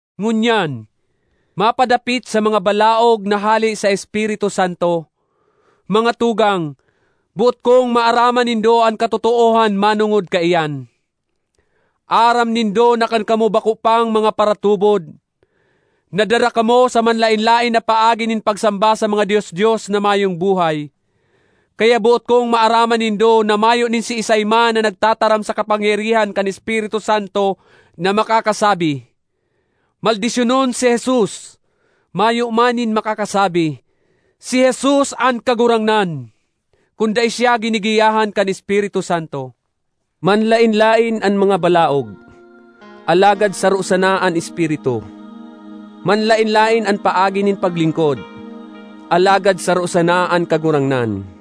Ngunyan, mapadapit sa mga balaog na hale sa Espiritu Santo. Mga tugang, boot kong maaraman nindo an katotoohan manongod kaiyan. Aram nindo na kan kamo bako pang mga paratubod, nadara kamo sa manlaen-laen na paagi nin pagsamba sa mga dios-dios na mayong buhay. Kaya boot kong maaraman nindo na mayo nin siisay man na nagtataram sa kapangyarihan kan Espiritu Santo na makakasabi, “Maldisyonon si Jesus!” Mayo man nin makakasabi, “Si Jesus an Kagurangnan!” kun dai siya ginigiyahan kan Espiritu Santo. Manlaen-laen an mga balaog, alagad saro sana an Espiritu. Manlaen-laen an paagi nin paglingkod, alagad saro sana an Kagurangnan.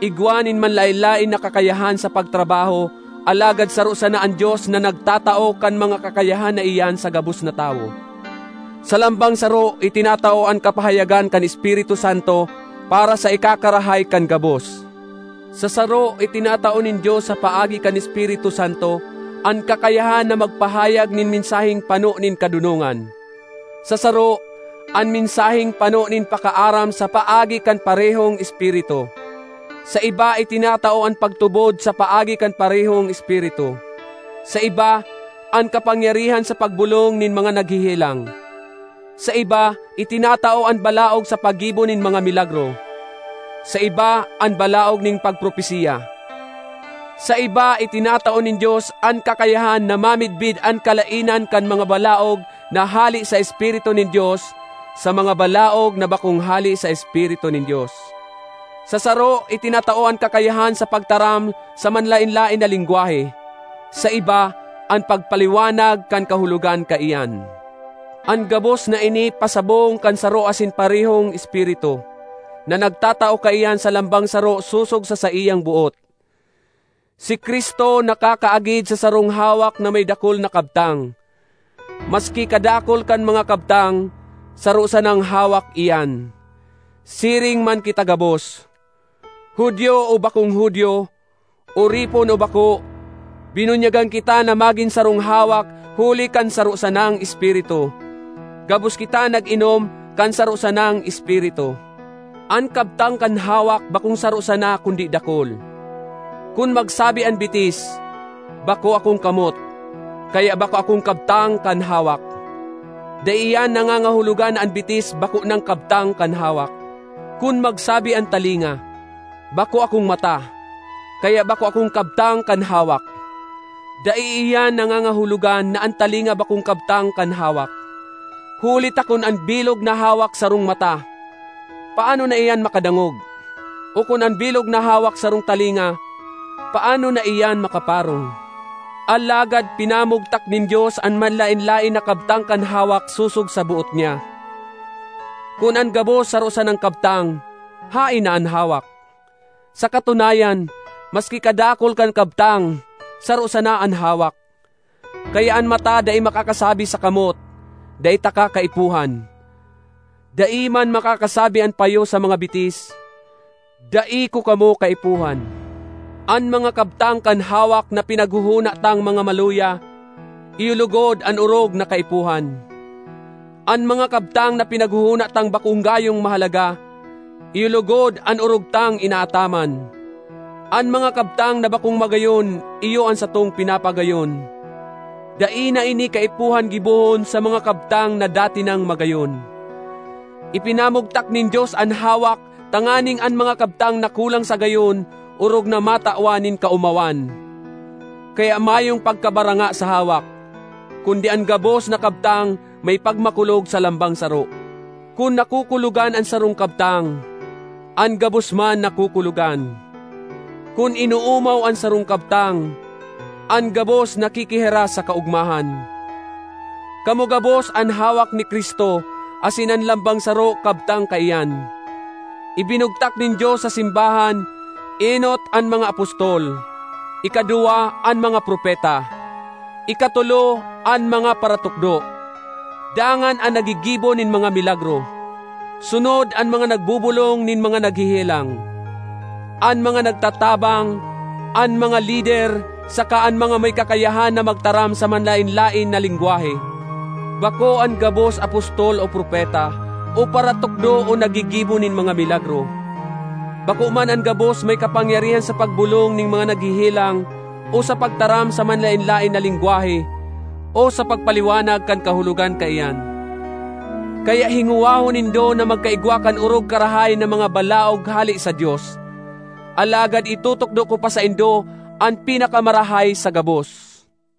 Igwa nin manlaen-laen na kakayahan sa pagtrabaho alagad saro sana an Dios na nagtatao kan mga kakayahan na iyan sa gabos na tawo. Sa lambang saro itinatao an kapahayagan kan Espiritu Santo para sa ikakarahay kan gabos. Sa saro itinatao nin Dios sa paagi kan Espiritu Santo an kakayahan na magpahayag nin mensaheng pano nin kadonongan; sa saro, an mensaheng pano nin pakaaram sa paagi kan parehong Espiritu. Sa iba itinatao an pagtubod sa paagi kan parehong Espiritu; sa iba, an kapangyarihan sa pagbolong nin mga naghehelang. Sa iba itinatao an balaog sa paggibo nin mga milagro; sa iba, an balaog nin pagpropesiya; sa iba itinatao nin Dios an kakayahan na mamidbid an kalaenan kan mga balaog na hale sa Espiritu nin Dios, sa mga balaog na bakong hale sa Espiritu nin Dios. Sa saro itinatao an kakayahan sa pagtaram sa manlaen-laen na lengwahe; sa iba, an pagpaliwanag kan kahulogan kaiyan. An gabos na ini pasabong kan saro asin parehong Espiritu, na nagtatao kaiyan sa lambang saro sosog sa saiyang boot. Si Cristo nakakaagid sa sarong hawak na may dakul na kabtang; maski kadakul kan mga kabtang, saro sanang hawak iyan. Siring man kita gabos—Judio o bakong Judio, oripon o bako—binunyagan kita na magin sarong hawak huli kan saro sanang Espiritu. Gabos kita nag-inom kan saro sanang Espiritu. An kabtang kan hawak bakong saro sana kundi dakul. Kun magsabi an bitis, “Bako akong kamot, kaya bako akong kabtang kan hawak,” dai iyan nangangahulogan na an bitis bako nang kabtang kan hawak. Kun magsabi an talinga, “Bako akong mata, kaya bako akong kabtang kan hawak,” dai iyan nangangahulogan na an talinga bakong kabtang kan hawak. Huli ta kun an bilog na hawak sarong mata, paano na iyan makadangog? O kun an bilog na hawak sarong talinga, paano na iyan makaparong? Alagad pinamugtak nin Dios an manlaen-laen na kabtang kan hawak sosog sa boot niya. Kun an gabos saro sanang kabtang, haen na an hawak? Sa katunayan, maski kadakul kan kabtang, saro sana an hawak. Kaya an mata dai makakasabi sa kamot, “Dai taka kaipuhan!” Dai man makakasabi an payo sa mga bitis, “Dai ko kamo kaipuhan!” An mga kabtang kan hawak na pinaghohona tang mga maluya iyo logod an orog na kaipuhan. An mga kabtang na pinaghohona tang bako gayong mahalaga, iyo logod an orog tang inaataman. An mga kabtang na bakong magayon iyo an satong pinapagayon; dai na ini kaipuhan gibohon sa mga kabtang na dati nang magayon. Ipinamugtak nin Dios an hawak tanganing an mga kabtang na kulang sa gayon orog na matawan nin kaomawan. Kaya mayong pagkabaranga sa hawak, kundi an gabos na kabtang may pagmakulog sa lambang saro. Kun nakukulogan an sarong kabtang, an gabos man nakukulogan. Kun inoomaw an sarong kabtang, an gabos nakikihiras sa kaogmahan. Kamo gabos an hawak ni Cristo asin an lambang saro kabtang kaiyan. Ibinugtak nin Dios sa simbahan, enot, an mga apostol; ikaduwa, an mga propeta; ikatolo, an mga paratukdo; dangan an naggigibo nin mga milagro; sunod an mga nagbobolong nin mga naghehelang, an mga nagtatabang, an mga lider, saka an mga may kakayahan na magtaram sa manlaen-laen na lengwahe. Bako an gabos apostol o propeta o paratukdo o naggigibo nin mga milagro. Bako man an gabos may kapangyarihan sa pagbolong nin mga naghehelang o sa pagtaram sa manlaen-laen na lengwahe o sa pagpaliwanag kan kahulogan kaiyan. Kaya hingowahon nindo na magkaigwa kan orog karahay na mga balaog hale sa Dios. Alagad itutukdo ko pa saindo an pinakamarahay sa gabos.